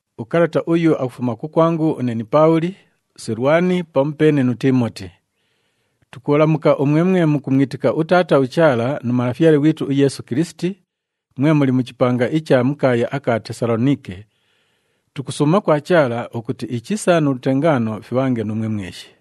Ukalata uyu akufuma kukwangu une ni Paabhuli, uSilwani pamupeene nu Tiimoti. Tukubhalamuka umwe mwe mukumwitika uTaata uChaala nu Malafyale ghwitu uYeesu Kilisiti, mwe muli mu chipanga icha mu kaaya aka Tesaloniike. Tukusuuma kwa Chaala ukuti ichisa nu lutengaano fibhange nuumwe mweshi.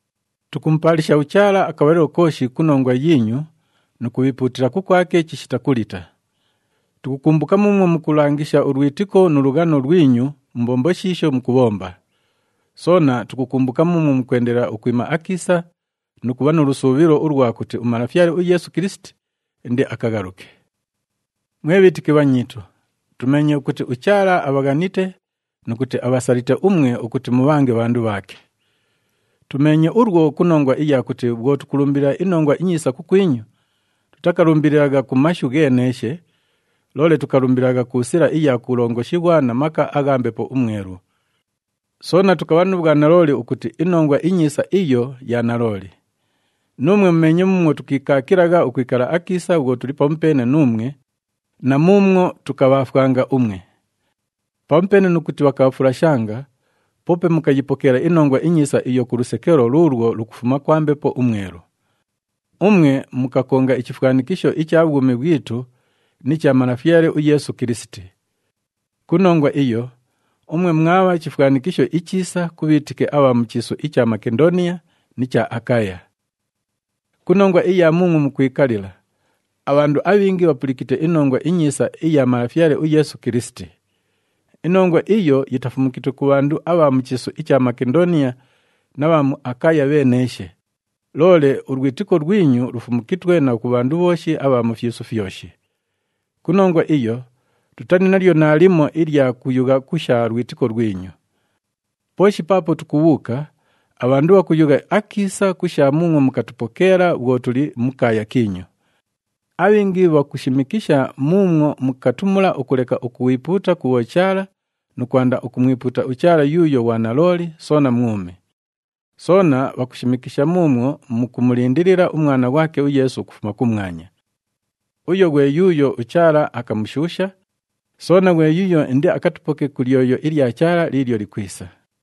Tukumupaalisha uChaala akabhalilo kooshi ku nongwa yiinyu nu kubhiipuutila kukwake chishita kulita. Tukukumbuka muumwo mukulangisha ulwitiko nu lughano lwinyu mu mbombo shiisho mukubhomba. Soona tukukumbuka muumwo mukwendelela ukwima akiisa nu kubha nu lusuubhilo ulwa kuti uMalafyale uYeesu Kilisiti indiakaghaluke. Mwe bhiitiki bhanyiitu, tumeenye ukuti uChaala abhaghanite nu kuti abhasalite umwe ukuti mubhange bhandu bhaake. Tumeenye ulwo ku nongwa iya kuti bhwo tukulumbilila iNongwa iNyiisa kukwinyu, tutakalumbililagha ku mashu gheeneeshe, loole tukalumbililagha ku sila iya kulongoshighwa na maka agha Mbepo uMwelu. Soona tukabha nu bhwanalooli ukuti iNongwa iNyiisa iyo ya nalooli. Nuumwe mumeenye muumwo tukiikaakilagha ukwikala akiisa bhwo tuli pamupeene nuumwe na muumwo tukabhaafwanga umwe. Pamupeene nu kuti bhakabhafulashanga, poope mukayipokeela iNongwa iNyiisa iyo ku lusekelo luulwo lukufuma kwa Mbepo uMwelu. Umwe mukakonga ichifwanikisho icha bhwumi bhwitu ni cha Malafyale uYeesu Kilisiti. Ku nongwa iyo, umwe mwabha chifwanikisho ichiisa ku bhiitiki abha mu chiisu icha Makendooniya ni cha Akaya. Ku nongwa iya muumwo mukwikalila, abhandu abhingi bhapulikite iNongwa iNyiisa iya Malafyale uYeesu Kilisiti. Inongwa iyo yitafumukitwe ku bhandu abha mu chiisu icha Makendooniya na bha mu Akaya bheeneeshe, loole ulwitiko lwinyu lufumukitwe na ku bhandu bhooshi abha mu fyisu fyoshi. Ku nongwa iyo, tutali nalyo naalimo ilya kuyugha ku sha lwitiko lwinyu. Pooshi paapo tukubhuuka, abhandu bhakuyugha akiisa ku sha muumwo mukatupokeela bhwo tuli mu kaaya kiinyu. Abhingi bhakushimikisha muumwo mukatumula ukuleka ukwipuuta ku bhochaala nu kwanda ukumwipuuta uChaala yuuyo ghwa nalooli soona mwumi. Soona bhakushimikisha muumwo mukumulindilila uMwana ghwake uYeesu ukufuma kumwanya. Uyo ghwe yuuyo uChaala akamushuusha, soona ghwe yuuyo indiakatupoke ku lyoyo ilya Chaala liilyo likwisa.